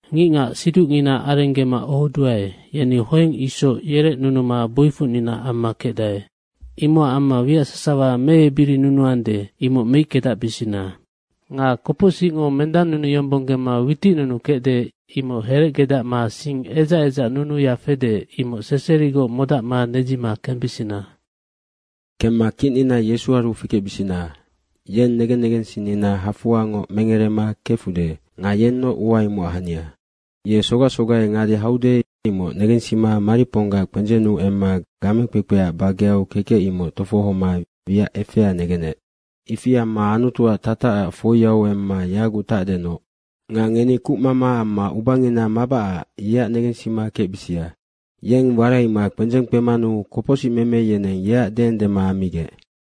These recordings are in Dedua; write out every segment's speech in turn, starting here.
Ngicngac siducngina arenggema ohoduae, yeni hoeng isoc yerecnunuma boifocnina amma kecdae. Imocac amma wiac sasawa meebirinunuande, imoc meickedacbisina. Nga kopocsicngo mendannunuyombonggema witicnunukecde, imoc herecgedacma sing edzac edzacnunuya fede, imoc seserigoc modacma nedzima kembisina. Kemma kicnina Yesuaru fikecbisina. Yeng negen negensinnina hafoangoc mengerema kefude nga yennoc ua imocac hania. Ye sogac sogai ngade haude, imoc negensima mariponggac kpendzennu emma game kpekpe bageau kekec, imoc tofohoma wiac efea negenec. Ifi amma Anutuac tatacac foiau emma yaguc tacdenoc. Nga ngeni kucmama amma ubangina mabacac yeac negensima kecbisia. Yeng waraima kpendzeng kpemanu kopocsicmeme yeneng yeac deendema ammigec.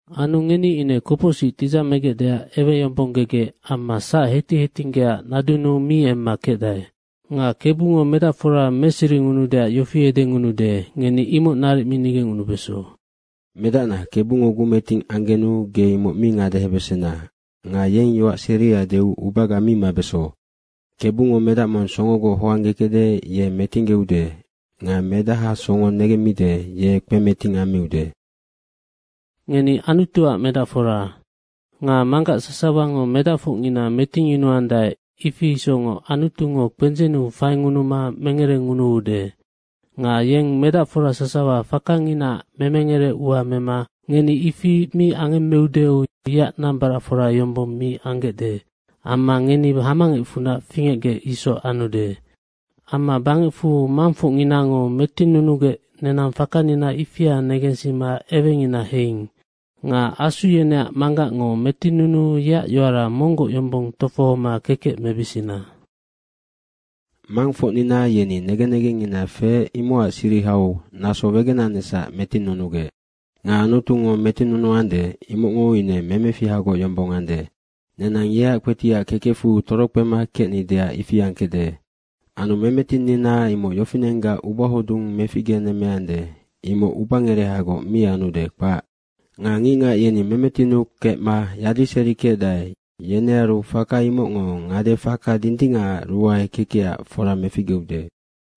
Anu ngeni ine kopocsic tidzamegecdeac eweyombonggegec amma sac hetic hetinggeaac nadunnu mi emma kecdae. Nga Kebungo medacfora meseringunuudeac yofi edengunude, ngeni imoc naric mi nigecngunubeso. “Medacna, Kebungo gumeting anggenu ge imoc mi ngadehebesena nga yeng yoac seria deu ubaga mi mabeso. KEBUNGO medac mong songogoc hoanggekecde, ye metinggeude nga medaha songo negemmide, ye kpemeting ammiude.” Ngeni Anutuac medacfora. Nga manggac sasawango medacfocngina metingyunuandae, ifi isocngoc Anutungo kpendzennu faingunuma mengerengunuude. Nga yeng medacfora sasawa fakanginaac memengere ua mema ngeni ifi mi angemmeudeu yeac nambaracfora yombong mi anggecde amma ngeni hamangecfunac fingecgec isoc anude. Amma bangecfu mangfocninango metinnunugec nenang fakangina ifia negensima ewengina heiing. Nga asu yeneac Manggacngo metinnuu yeac yoara monggoc yombong tofohoma kekec mebisina. Mangfocnina yeni negen negengngina feec, imocac sirihau naso wegenanecsac metinnunugec nga Anutungo metinnunuande, imocngo ine memefihagoc yombong ande. Nenang yeac kpetiac kekecfu torokpema kecnideac ifi angkecde. Anu memetinnina imoc yofinenggac ubahodung meficgenemmeande, imoc ubangerehagoc mi anude, kpac. Nga ngicngac yeni memetinnu kecma yadiserikecdae, yenearu faka imocngo ngade faka dindingacac ruae kekecac fora meficgeude.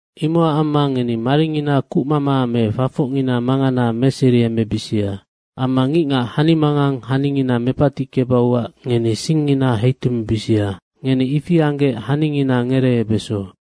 Imocac amma ngeni maringina kucmama me fafocngina mangana meseriemebisia. Amma ngicngac hanimangang haningina mepatickebauac ngeni singngina heitumebisia. Ngeni ifi anggec haningina ngereebeso.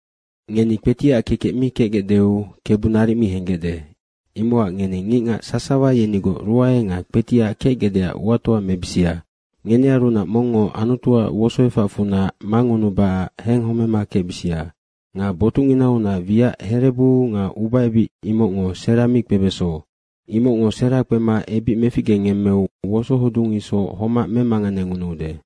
Ngeni kpetiac kekec mi kecgecdeu Kebu naric mi henggecde, imocac ngeni ngicngac sasawa yenigoc ruae nga kpetiac kecgecdeac uatoa mebisia. Ngenearunac mongngo Anutuac wosoefacfunac mangunubacac henghomema kecbisia. Nga botucnginaunac wiac herebu nga ubaebic imocngo sera mi kpebeso. Imocngo sera kpema ebic meficgengemmeu wosohodung isoc homac memanganengunuude.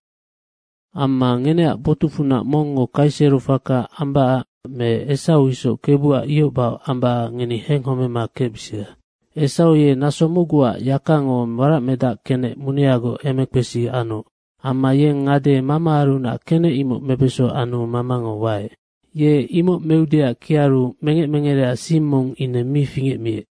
Amma ngeneac botucfunac mongngo kaisero faka ambacac me Esau isoc Kebuac ihoc bahoc ambacac ngeni henghomema kecbisia. Esau ye naso mocguac yakango waracmedacac kenec muneagoc emekpesi anoc. Amma yeng ngade mamaarunac kenec imoc mebeso anu mamango waec. Ye imoc meudeac kiaru mengec mengereac sing mong ine mi fingecmiec.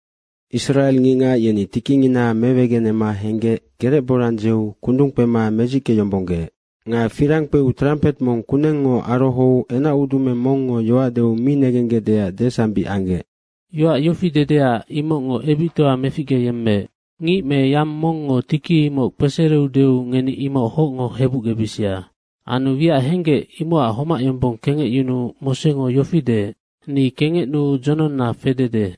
Israe ngicngac yeni tikingina mewegenema henggec gerecborang dzeu kundung kpema medzickeyombonggeec. Nga firang kpeu trampet mong kunengngo arohou enacudumeng mongngo yoac deu mi negenggecdeac desambic anggec. Yoac yofi dedea, imocngo ebictoa meficgeyemmeec, “Ngic me yang mongngo tiki imoc kpesereudeu ngeni imoc hocngo hebucgebisia.” Anu wiac henggec imocac homac yombong kengecyunuu Mosengo yofi deec, “Ni kengecnuu dzononna fedede.”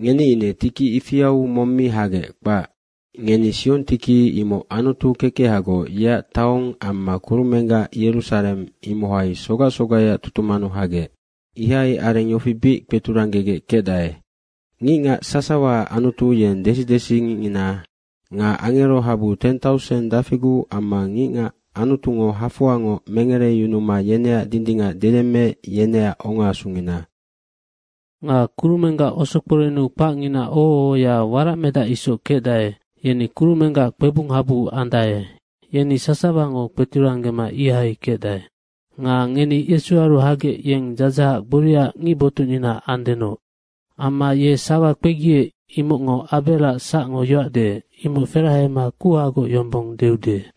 Ngeni ine tiki ifiau mong mi hagec, kpac. Ngeni Siong tiki, imoc Anutu kekehagoc yeac taong amma kurumenggac Yerusareng, imohai sogac sogaiac tutumannu hagec. Ihai areng yofi bic kpeturanggegec kecdae. Ngicngac sasawaac Anutu, yeng desi desingicngina. Nga Angero habu teng tauseng dafiguc amma ngicngac Anutungo hafoangoc mengereyunuma yeneac dindingac deyemmeec, yeneac ongaasungina. Nga kurumenggac osokporennu kpacngina oho ohoya waracmedac isoc kecdae, yeni kurumenggac kpebung habu andae. Yeni sasawango kpeturanggema ihai kecdae. Nga ngeni Yesuaru hagec yeng dzadzahac gboriaac ngic botucnina andenoc. Amma ye sawa kpegiec, imocngo Abeac sacngo yoac deec, imoc ferahema kuhagoc yombong deude.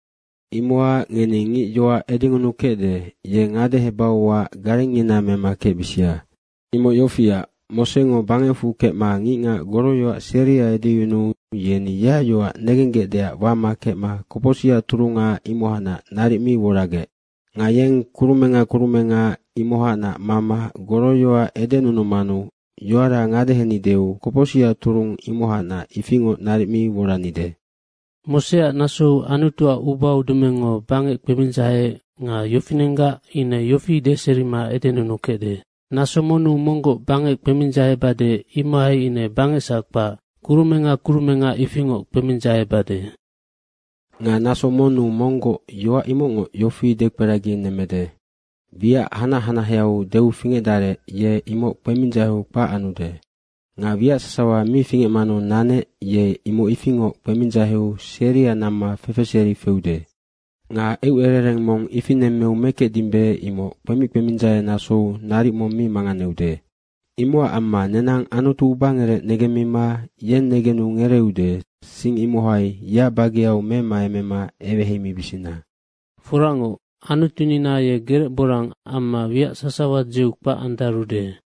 Imocac ngeni ngic yoac edengunukecde, ye ngadehebauac garengngina mema kecbisia. Imoc yofiac, Mosengo bangecfu kecma ngicngac goroyoac seria edeyunuu yeni yeac yoac negenggecdeac wama kecma kopocsicac turunga, imohacnac naric mi woragec. Nga yeng kurumenga kurumenga imohacnac mama goroyoac edenunumanu yoara ngadehenideu kopocsicac turung imohacnac ifingoc naric mi woranide. Moseac nasou Anutuac ubaudumengngo bangec kpemindzaheec nga yofinenggac ine yofi deserima edenunukecde, “Naso monnu monggoc bangec kpemindzahebade, imohai ine bangecsac kpac, kurumenga kurumenga ifingoc kpemindzahebade.” Nga “Naso monnu monggoc.” yoac imocngo yofi dekperaginemmede, wiac hanac hanaheau deu fingecdarec ye imoc kpemindzaheu kpac anude. Nga wiac sasawa mi fingecmanu nanec, ye imoc ifingoc kpemindzaheu seria namma fefeseri feude. Nga eucerereng mong ifi nemmeu mekecdimbe, imoc kpemic kpemindzahenasou naric mong mi manganeude. Imocac amma nenang Anutu ubangerec negemmima yeng negenu ngereeude, sing imohai yeac bageau memaemema eweheimibisina. Foracngoc, Anutunina ye gerecborang amma wiac sasawa dzeu kpac andarude.